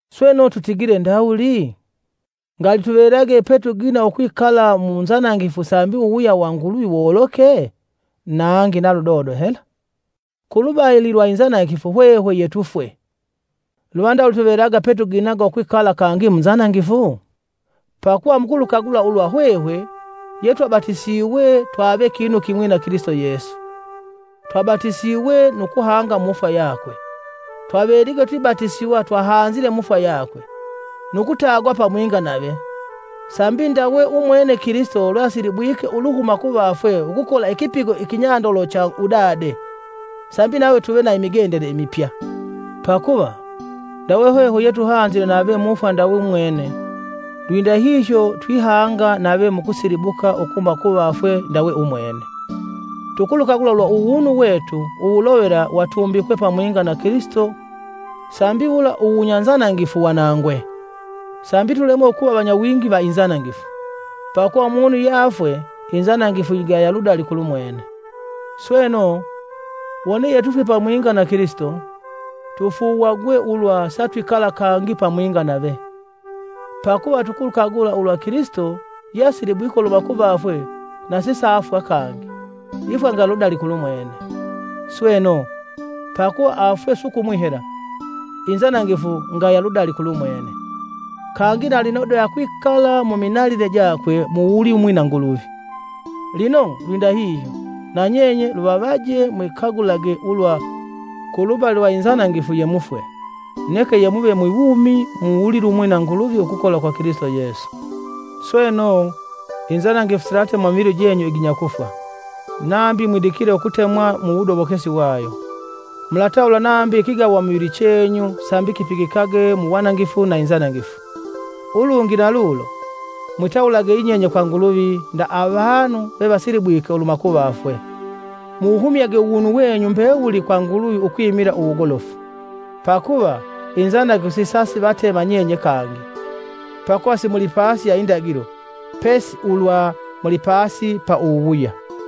Sweno, tutigile ndawuli? Ngali tuvelage petugina ukwikala munzanangifu sambi uwuwuya wa Nguluvi woloke? Nangi na ludodo hela! Kulubali lwa inzanangifu hwehwe yetufwe, luva ndawuli tuvelage petugina ukwikala kangi mu nzanangifu? Pakuva, mukulukagula ulwa hwehwe yetwabatisiwe twave kinu kimwi na Kilisito Yesu, twabatisiwe nu kuhanga mufwa yakwe. Twavelige twibatisiwa twahanzile mufwa yakwe, nu kutagwa pamwinga nave, sambi ndawe umwene Kilisito lweasilibwike uluhuma kuvafwe ukukola ikipigo ikinyandolo cha udade, sambi nahwe tuve na imigendele imipya. Pakuva, ndawe hwehwe yetuhanzile nave mufwa ndawe umwene, lwindahihyo twihanga nave mu kusilibuka ukuhuma kuvafwe ndawe Umwene. Tukulukagula ulwa uwunu wetu uwulovela watumbikwe pamwinga na Kilisito sambi wula uwunyanzanangifu wanangwe, sambi tulemwe ukuva vanyawingi va inzanangifu. Pakuva, umunu yeafwe inzanangifu yigaya ludali kulumwene. Sweno, wone yetufwe pamwinga na Kilisito, tufuuwagwe ulwa satwikala kangi pamwinga nave. Pakuva, tukulukagula ulwa Kilisito yeasilibwike uluhuma kuvafwe na sisaafwa kangi, ifwa ngaya ludali kulumwene. Sweno, pakuva afwe sukumwi hela, inzanangifu ngaya ludali kulumwene, kangi na lino de akwikala muminanile jakwe mu wulilumwi na Nguluvi. Lino, lwindahihyo na nyenye luvavaje mwikagulage ulwa kulubali lwa inzanangifu yemufwe, neke yemuve mwi wumi mu wulilumwi na Nguluvi ukukola kwa Kilisito Yesu. Sweno, inzanangifu silatema mu mivili jenyu iginya kufwa, nambi mwidikile ukutemwa mu wudobokesi wayo. Mulatawula nambi ikigawa muvili chenyu sambi kipigikage mu wanangifu na inzanangifu. Ulungi na lulo, mwitawulage yinyenye kwa Nguluvi nda avanu vevasilibwike uluhuma kuvafwe, muwuhumyage uwunu wenyu mbewuli kwa Nguluvi ukwimila uwugolofu. Pakuva, inzanangifu sisasivatema nyenye kangi, pakuva simulipasi ya indagilo, pesi ulwa mulipasi pa uwuwuya.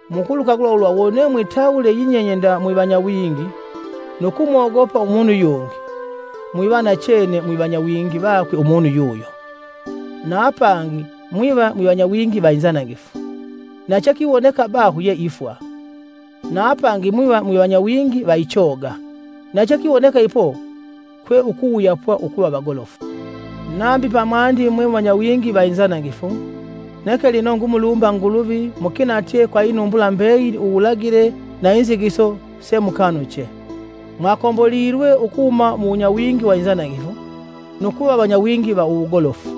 Mukulukagula ulwa wone mwitawule yinyenye nda mwivanyawingi nu kumogopa umunu yungi, mwiva nachene mwivanyawingi vakwe umunu yuyo. Na apangi mwiva vanyawingi va inzanangifu, na chekiwoneka baho ye ifwa, na apangi mwiva vanyawingi vaichoga, na chekiwoneka ipo kwe ukuwuyapwa ukuva vagolofu. Nambi pamwandi mwe mwivanyawingi va inzanangifu, neke lino ngumulumba Nguluvi mukinatye kwa inumbula mbeyili uwulagile na inzigiso semukanuche. Mwakombolilwe ukuhuma mu wunyawingi wa inzanangifu, nu kuva vanyawingi va uwugolofu.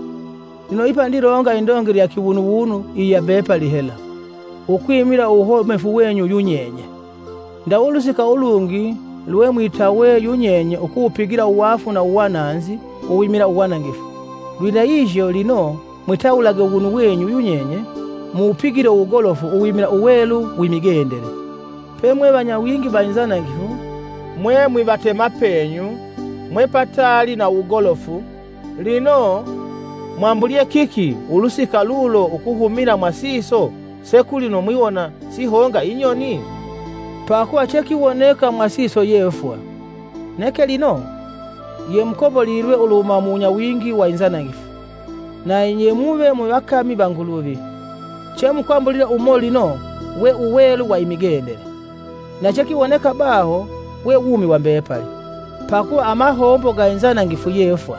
Lino ipa ndilonga indongele ya kiwunuwunu iya mbepali hela, ukwimila uwuhomefu wenyu yunyenye. Ndawe ulusika ulungi lwemwitawe yunyenye ukuwupigila uwaafu na uwananzi uwimila uwanangifu, lwindahihyo lino mwitawulage uwunu wenyu yunyenye muwupigile uwugolofu uwimila uwelu wi migendele. Pemwevanyawingi wa inzanangifu, mwe mwivatemapenyu mwe pataali na uwugolofu. Lino, mwambulyee kiki ulusika lulo ukuhumila mwasiso se kulino mwiwona sihonga inyoni? Pakuva chekiwoneka mwasiso ye fwa! Neke lino yemukombolilwe uluhuma mu wunyawingi wa inzanangifu, na yemuve mwivakami va Nguluvi, chemukwambulila umo lino we uwelu wa imigendele, na chekiwoneka baho we wumi wa mbepali. Pakuva amahombo ga inzanangifu ye fwa,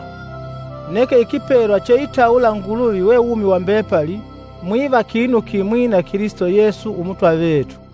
neke ikipelwa cheitawula Nguluvi we wumi wa mbepali mukuva kinu kimwi na Kilisito Yesu Umutwa vetu.